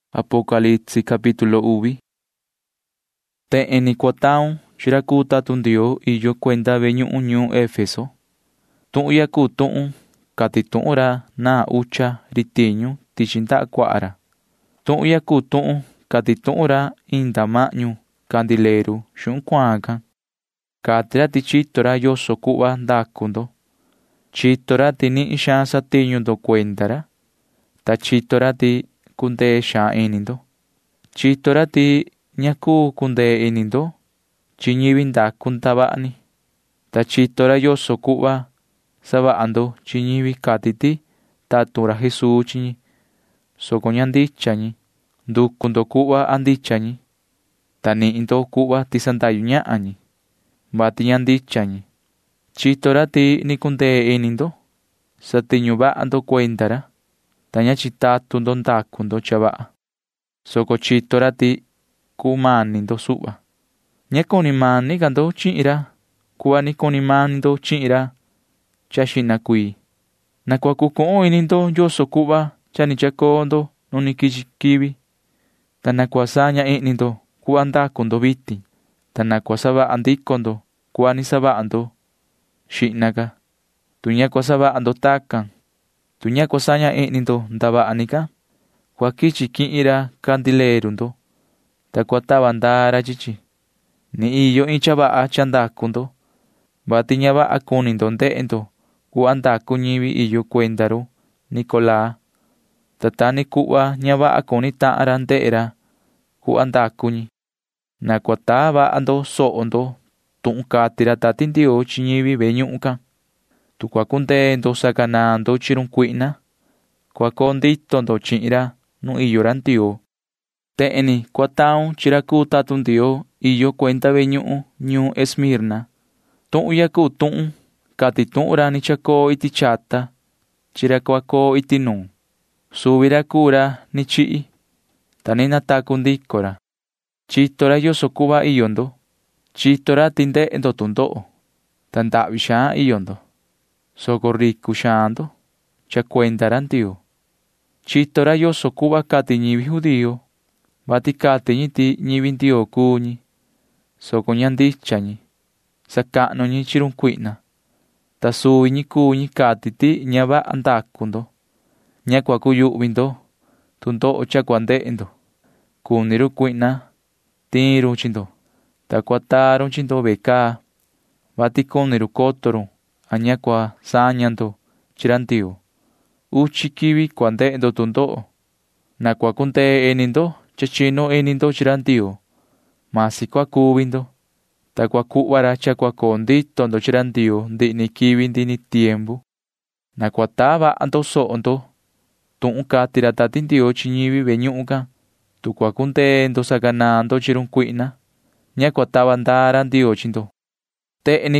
[Ni vii cahan racan chihin yu:] ’Tehen ni cua taun chi ra cuu tatun Ndioo iyo cuenda ve ñuhun ñuun Efeso: “Tuhun ya cuu tuhun cati tuhun ra naan ucha ri tiñu tichi ndaha cuaha ra. Tuhun ya cuu tuhun cati tuhun ra inda mahñu candileru xuhun cuaan can. Cati ra ti chito ra yoso cuhva ndacu ndo. Chito ra ti nihin xaan satiñu ndo cuenda ra, ta chito ra ti cundee xaan ini ndo. Chito ra ti ña cuu cundee ini ndo chi ñivi ndacu ndavaha ni, ta chito ra yoso cuhva savaha ndo chi ñivi cati ti tatun ra Jesuu chi ñi, soco ña ndicha ñi. Nducu ndo cuhva a ndicha ñi, ta nihin ndo cuhva ti sandahyu ñahan ñi, vati ña ndicha ñi. Chito ra ti ni cundee ini ndo. Satiñu vaha ndo cuenda ra, ta ña chitatun ndo ndacu ndo cha vaha, soco chito ra ti cumani ndo suhva. Ña cuni mani ca ndo chihin ra cuhva ni cuni mani ndo chihin ra xihna cuii. Na cua cucuhun ini ndo yoso cuhva cha ni chacoo ndo nu ni quichi quivi, ta na cua saña ihni ndo cuhva ndacu ndo vitin, ta na cua savaha ndico ndo cuhva ni savaha ndo xihna ca. Tu ña cua savaha ndo tacan, tu ña cua saña ihni ndo ndavaha ni can, cua quichi quihin ra candileru ndo, ta cua tava ndaa ra chi chi. Ni iyo iin cha vaha cha ndacu ndo, vati ña vaha cuni ndo ndehe ndo cuhva ndacu ñivi iyo cuenda run Nicolaa, ta ta ni cuhva ña vaha cuni tahan ra ndehe ra cuhva ndacu ñi. Na cua taa vaha ndo soho ndo tuhun cati ra Tati Ndioo chi ñivi ve ñuhun can. Tu cua cundee ndo sacanaan ndo chi run cuihna, cua coo ndito ndo chihin ra nu iyo ra Ndioo, cati ra.” [Ni vii cahan racan chihin yu:] ’Tehen ni cua taun chi ra cuu tatun Ndioo iyo cuenda ve ñuhun ñuun Esmirna: “Tuhun ya cuu tuhun cati tuhun ra ni chacoo iti chata chi ra cua coo iti nuun. Suvi ra cuu ra ni chihi, ta ni natacu ndico ra. Chito ra yoso cuhva iyo ndo. Chito ra ti ndehe ndo tu ndoho, ta ndahvi xaan iyo ndo, soco ricu xaan ndo cha cuenda ra Ndioo. Chito ra yoso cuhva cati ñivi judío, vati cati ñi ti ñivi Ndioo cuu ñi, soco ña ndicha ñi. Sacahnu ñi chi run Satanaa, ta suvi ñi cuu ñi cati ti ña vaha ndacu ndo. Ña cua cuyuhvi ndo tu ndoho cha cua ndehe ndo. Cuni run cuihna tiin run chi ndo, ta cua taa run chi ndo ve caa, vati cuni run coto run a ña cua saña ndo chi ra Ndioo. Uchi quivi cua ndehe ndo tu ndoho. Na cua cundee ini ndo cha chinu ini ndo chi ra Ndioo―masi cua cuvi ndo, ta cua cuhva ra cha cua coo ndito ndo chi ra Ndioo ndihi ni quivi ndihi ni tiempu. Na cua taa vaha ndo soho ndo tuhun cati ra Tati Ndioo chi ñivi ve ñuhun can. Tu cua cundee ndo sacanaan ndo chi run cuihna, ña cua tava ndaa ra Ndioo chi ndo, cati ra.”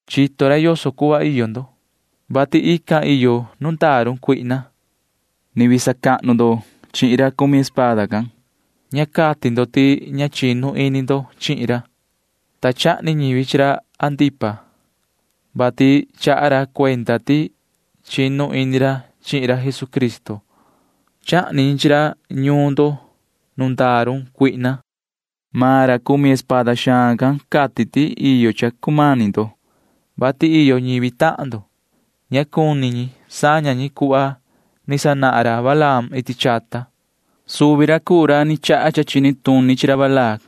Chito ra yoso cuhva iyo ndo, vati ican iyo nu ndaa run Satanaa. Ni vii sacahnu ndo chihin ra cumi espada can. Ña cati ndo ti ña chinu ini ndo chihin ra, ta chahni ñivi chi ra Antipa, vati chaha ra cuenda ti chinu ini ra chihin ra Jesucristo. Chahni ñi chi ra ñuun ndo nu ndaa run Satanaa. Maan ra cumi espada xaan can cati ti iyo cha cumani ndo, vati iyo ñivi tahan ndo―ña cuni ñi saña ñi cuhva ni sanahan ra Balaam iti chata. Suvi ra cuu ra chaha cha chini tuni chi ra Balac,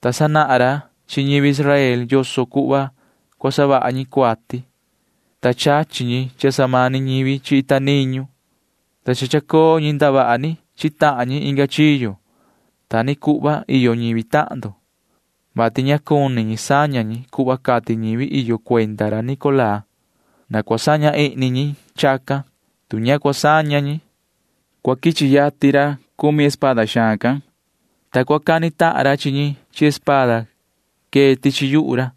ta sanahan ra chi ñivi Israel yoso cuhva cua savaha ñi cuati, ta chachi ñi cha samani ñivi chi ita niñu, ta cha chacoo ñi ndavaha ni chi tahan ñi inga chiyo. Ta ni cuhva iyo ñivi tahan ndo, vati ña cuni ñi saña ñi cuhva cati ñivi iyo cuenda ra Nicolaa. Na cua saña ihni ñi chacan. Tu ña cua saña ñi, cua quichi yatin ra cumi espada xaan can, ta cua cani tahan ra chi ñi chi espada quee tichi yuhu ra.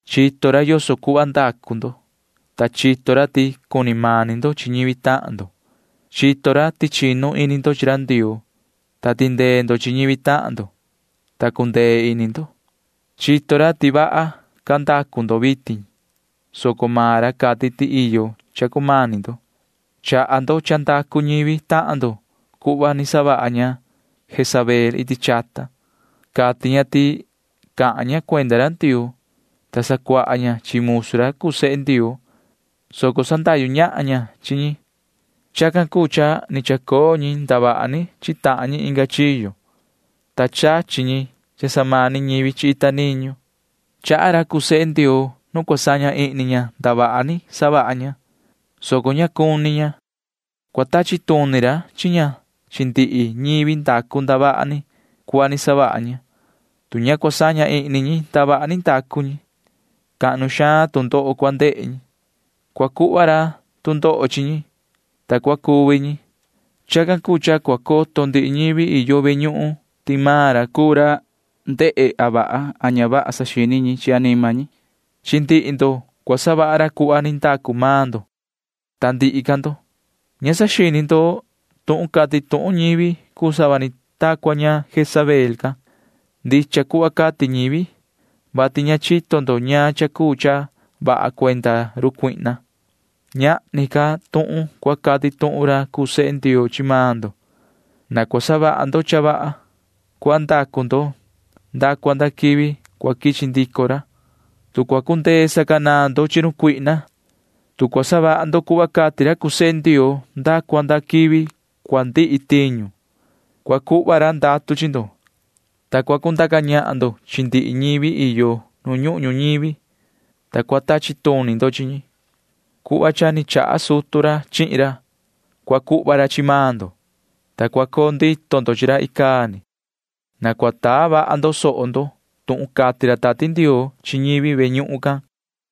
Chito ra yoso cuhva ndacu ndo, ta chito ra ti cuni mani ndo chi ñivi tahan ndo. Chito ra ti chinu ini ndo chi ra Ndioo, ta tindee ndo chi ñivi tahan ndo, ta cundee ini ndo. Chito ra ti vaha ca ndacu ndo vitin, soco maan ra cati ti iyo cha cumani ndo. Chaha ndo cha ndacu ñivi tahan ndo cuhva ni savaha ña Jezabel iti chata. Cati ña ti cahan ña cuenda ra Ndioo, ta sacuaha ña chi musu ra cuu sehe Ndioo, soco sandahyu ñahan ña chi ñi. Chacan cuu cha ni chacoo ñi ndavaha ni chi tahan ñi inga chiyo, ta chachi ñi cha samani ñivi chi ita niñu. Chaha ra cuu sehe Ndioo nu cua saña ihni ña ndavaha ni savaha ña, soco ña cuni ña. Cua tachi tuni ra chi ña chi ndihi ñivi ndacu ndavaha ni cuhva ni savaha ña. Tu ña cua saña ihni ñi ndavaha ni ndacu ñi, cahnu xaan tu ndoho cua ndehe ñi. Cua cuhva ra tu ndoho chi ñi, ta cua cuvi ñi. Chacan cuu cha cua coto ndihi ñivi iyo ve ñuhun ti maan ra cuu ra ndehe a vaha a ña vaha saxini ñi chi anima ñi. Chi ndihi ndo cua savaha ra cuhva ni ndacu maan ndo. Ta ndihi ca ndo―ña saxini ndo tuhun cati tuhun ñivi cuu sava ni ta cua ña Jezabel can. Ndicha cuhva cati ñivi, vati ña chito ndo ñaan cha cuu cha vaha cuenda run Satanaa. Ñahni ca tuhun cua cati tuhun ra cuu sehe Ndioo chi maan ndo. Na cua savaha ndo cha vaha cuhva ndacu ndo nda cua nda quivi cua quichi ndico ra. Tu cua cundee sacanaan ndo chi run cuihna, tu cua savaha ndo cuhva cati ra cuu sehe Ndioo nda cua nda quivi cua ndihi tiñu, cua cuhva ra ndatu chi ndo, ta cua cundaca ñahan ndo chi ndihi ñivi iyo nu ñuhun ñuñivi, ta cua tachi tuni ndo chi ñi. Cuhva cha ni chaha sutu ra chihin ra cua cuhva ra chi maan ndo, ta cua coo ndito ndo chi ra icaa ni. Na cua taa vaha ndo soho ndo tuhun cati ra Tati Ndioo chi ñivi ve ñuhun can, cati ra.”